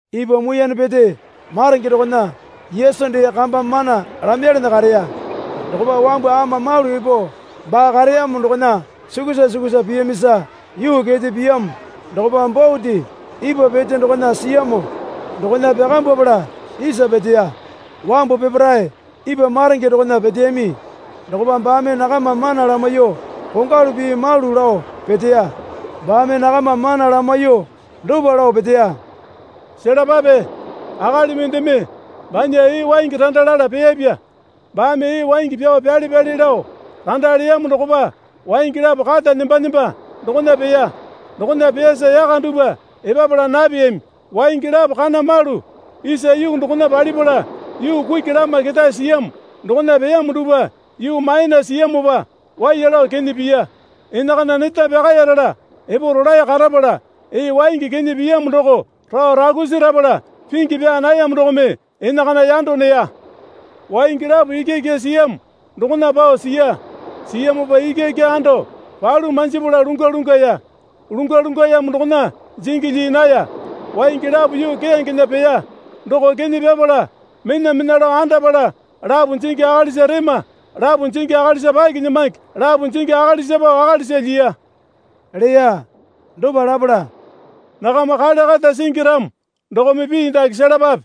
Ipwa muiyane pete maronge dokona Yesu dee kamba mana lamaiyalana kareya. Dokopa wambu ama malu epo baa kareyamo dokona sukusa sukusa piyamisa yuu kete piyamo dokopa bote ipwa pete dokona siyamo dokona pyakambwapala isa peteya. Wambu peparae ipwa maronge dokona peteyami. Dokopa baame nakama mana lamaiyuo kongwalu pii malu lao peteya. Baame nakama mana lamaiyuo dopa lao peteya. Selapape. Akali mendeme banya ee waingi randa lala peyapya. Baame ee waingi pyao pyale pyale lao randa leyamo dokopa waingi lapo kata nemba nemba dokona peya. Dokona peyasa yaka dupwa epapala napeyami. Waingi lapo kana malu isa yuu dokona palipala yuu kuki lama ketae siyamo dokona peyamo dupwa yuu maena siyamopa waiya lao kene piya. Enakana neta pyakayarala epo rolae karapala ee waingi kene piyamo doko rao rakusi rapala pingi pyaa nayamo dokome enakana yando neya. Waingi lapo ikyaikya siyamo dokona pao siya. Siyamopa ikyaikya ando palu manjipala lungwa lungwaya. Lungwa lungwayamo dokona jingi lyii naya. Waingi lapo yuu keyangena peya. Doko kene pyapala menamena lao andapala, lapo jingi akalisa rema, lapo jingi akalisa pakinyamange, lapo jingi akalisa pao akalisa lyiya, leya. Dopa lapala, Nakama kale kata singi ramo dokome pii dake selapape,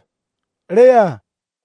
leya.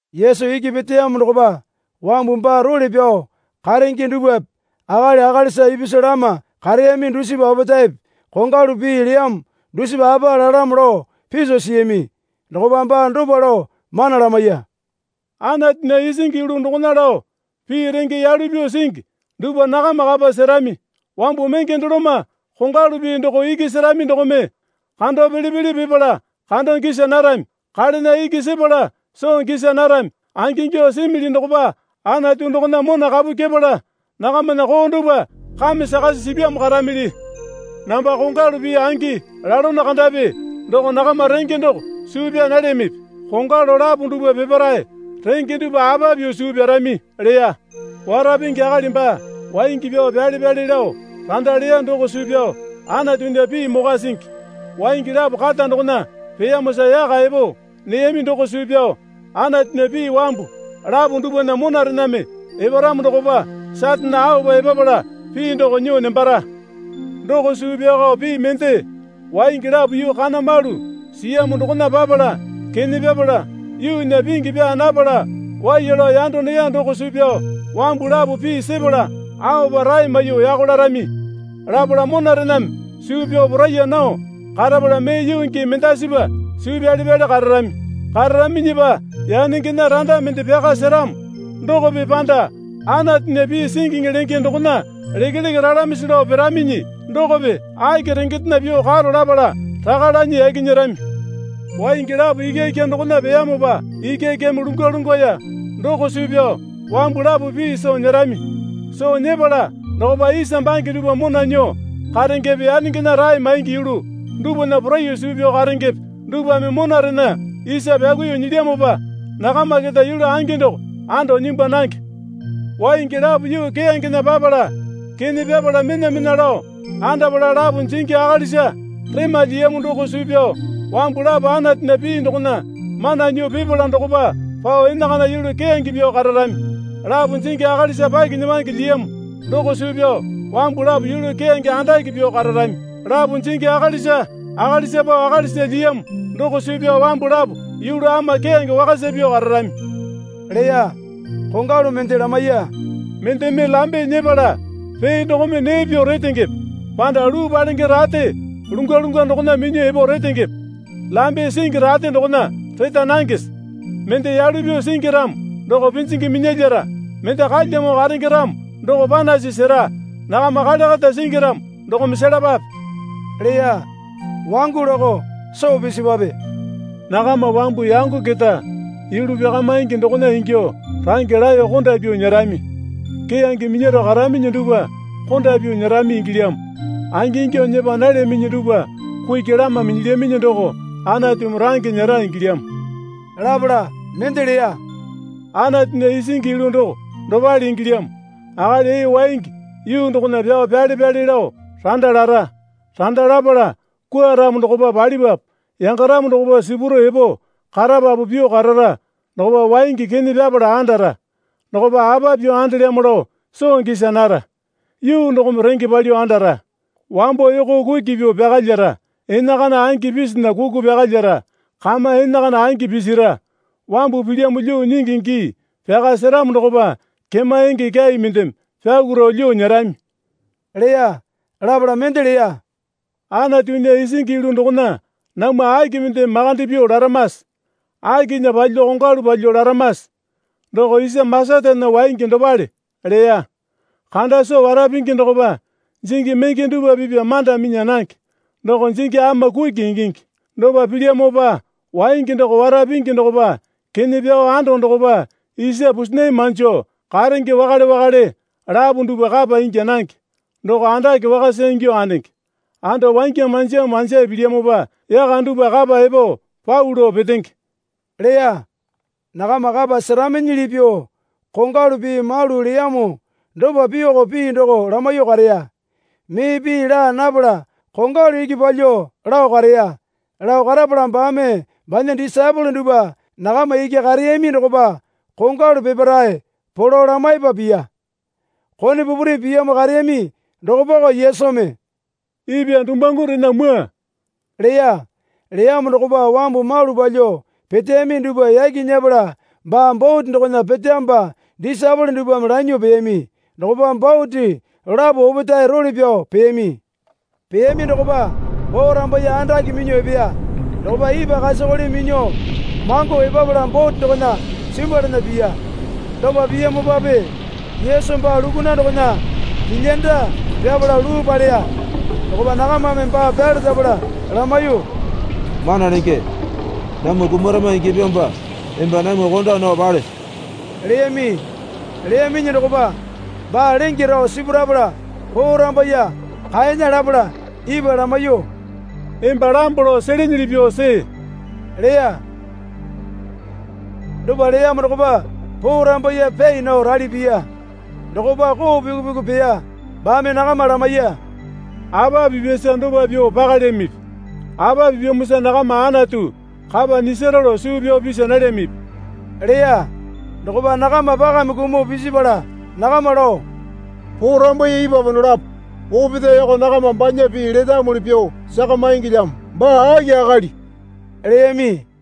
Yesu iki peteyamo dokopa wambu baa role pyao karenge dupwape akali akalisa ipisu lama kareyami dusipa opetaepe kongwalu pii leyamo dusipa apa lalamo lao piso siyami. Dokopa baa dopa lao mana lamaiya. Anatunya isingi yulu dokona lao pii renge yalu pyuo singi dupwa nakama kapa serami. Wambu menge doloma kongwalu pii doko iki serami dokome, Kando pele pele pipala kando gisa narami. Kalena iki sepala soo gisa narami. Angingyuo simili dokopa Anatu dokona mona kapu kyepala, nakamana koo dupwa kame sakasi sipyamo karamili. Namba kongwalu pii angi lalono kandapi doko nakama renge doko suu pyaa nalyamipi? Kongwalu lapo dupwa peparae renge dupwa apa pyuo suu pyarami? leya. Wara pingi akali baa waingi pyao pyale pyale lao randa leya doko suu pyao Anatunya pii mokwa singi. Waingi lapo kata dokona peyamosa yaka epo neyami doko suu pyao Anatunya pii wambu lapo dupwana monarename eparamo dokopa Satane aopa epapala pii doko nyuo nembara. Doko suu pyaoko pii mende, waingi lapo yuu kana malu siyamo dokona papala kene pyapala yuunya pingi pyaa napala waiya lao yando neya doko suu pyao wambu lapo pii sepala aopa rae maiyuo yako larami. Lapala monarename suu pyao poraiya nao karapala mee yuu gii mendasipa suu pyale pyale kararami. Kararaminyipa yanengena randa mende pyaka seramo dokope panda Anatunya pii singiŋi lenge dokona lekeleke ralamisi lao piraminyi dokope aki rengendena pyuo karo, lapala raka lanyi yaki nyerami. Waingi lapo ikyaikya dokona peyamopa ikyaikyame lungwa lungwaya doko suu pyao wambu lapo pii soo nyerami. Soo nyepala dokopa isa bange dupwa mona nyuo karengepe yanengena rae maingi yulu dupwana poraiyuo suu pyao karengepe dupwame monarena isa pyakuiyuo nyilyamopa nakama keta yulu angi doko ando nyimbwa nange. Waingi lapo yuu keyangena papala kene pyapala menamena lao andapala lapo jingi akalisa rema lyiyamo doko suu pyao wambu lapo Anatunya pii dokona mana nyuo pipala dokopa pao enakana yulu keyange pyuo kararami. Lapo jingi akalisa pakinyamange lyiyamo doko suu pyao wambu lapo yulu keyange andake pyuo kararami. Lapo jingi akalisa akalisa pao akalisa lyiyamo doko suu pyao wambu lapo yulu ama keyange wakasa pyuo kararami, leya. Kongwalu mende lamaiya. Mendeme lambe nyepala pee dokome nee pyuo retengepe panda luu palenge rate lungwa lungwa dokona minyuo epo retengepe? Lambe singi rate dokona reta nangese? Mende yalu pyuo singi ramo doko pinjingi minyalyara. Mende kalyamo karenge ramo doko panasi sera. Nakama kale kata singi ramo dokome selapape, leya. Wangu lakao soo pisipwape. Nakama wambu yango keta yulu pyakamaingi dokona ingyuo range laeyo konda pyuo nyerami. Keyange minyaro karaminyi dupwa konda pyuo nyerami ingilyamo. Angingyuo nyepa nalyaminyi dupwa kuki lama minyilyaminyi doko Anatumi range nyera ingilyamo. Lapala mende leya. Anatunya isingi yulu doko dopale ingilyamo. Akali ee waingi yuu dokona pyao pyale pyale lao randa lara. Randa lapala kwuaramo dokopa palipapu yangaramo dokopa sipuro epo karapapu pyuo karara dokopa waingi kene pyapala andara. Dokopa apa pyuo andelyamo lao soo gisa nara. Yuu dokome renge palyuo andara. Wambo yoko kuki pyuo pyakalyara, enakana angi pisinya kuku pyakalyara, kama enakana angi pisira. Wambu pilyamo lyuo nyingi gii pyaka seramo dokopa kema enge kyai mendeme pyakuro lyuo nyerami, leya. Lapala mende leya. Anatunya isingi yulu dokona namwa aki mendeme makande pyuo laramase? Akinya palyuo kongwalu palyuo laramase? Doko isa masatana waingi dopale, leya. Kanda soo wara pingi dokopa jingi menge dupwa pipwa manda minya nange. Doko jingi ama kuki ingingi. Dopa pilyamopa waingi doko wara pingi dokopa kene pyao ando dokopa isa pusinai manjo karenge wakale wakale lapo duwpa kapa ingya nange. Doko andake wakasa ingyuo andenge. Anda wangya manjamo manjae pilyamopa yaka dupwa kapa epo pau lao petenge, leya. Nakama kapa seraminyili pyuo kongwalu pii malu leyamo dopa pyuoko pii doko lamaiyuo kareya. Mee pii laa napala kongwalu iki palyuo lao kareya. Lao karapala baame banya disaepole dupwa nakama iki kareyami dokopa kongwalu peparae polo lamaipa piya. Kone pupuri piyamo kareyami dokopako Yesumi, Ipwa dumuwangurena mwua, leya. Leyamo dokopa wambu malu palyuo peteyami dupwa yaki nyepala baa bote dokona peteyamopa disaepole dupwame lanyuo peyami. Dokopa bote lapo opetae role pyao peyami. Peyami dokopa porambaiye andake minyuo epeya. Dokopa ipwa kasakole minyuo mango epapala bote dokona simbwalana piya. Dopa piyamopape Yesu baa lukuna dokona kilyanda pyapala luu paleya. Dokopa nakamame baa pyalerapala lamaiyuo, Mana Lenge, namwa kumarama ingyapyamopa emba namwa konda nao palese? leyami. Leyaminyi dokopa baa lenge rao sipurapala porambaiye kaena lapala, ipwa lamaiyuo, Emba lambo lao selenyili pyuo see, leya. Dopa leyamo dokopa porambaiye pyai nao rali piya. Dokopa koo pyuku pyuku peya. Baame nakama lamaiya. Apa pipyasa dopa pyuo pakalyamipi? Apa pipyamosa nakama Anatu kapa nyisara lao suu pyao pisa nalyamipi? leya. Dokopa nakama pakame kumuo pisipala nakama lao, Porambaiye ipwapa dolapo opetaeko nakama banya pii letamuli pyuo sakamangilyamo, Baa aki akali? leyami.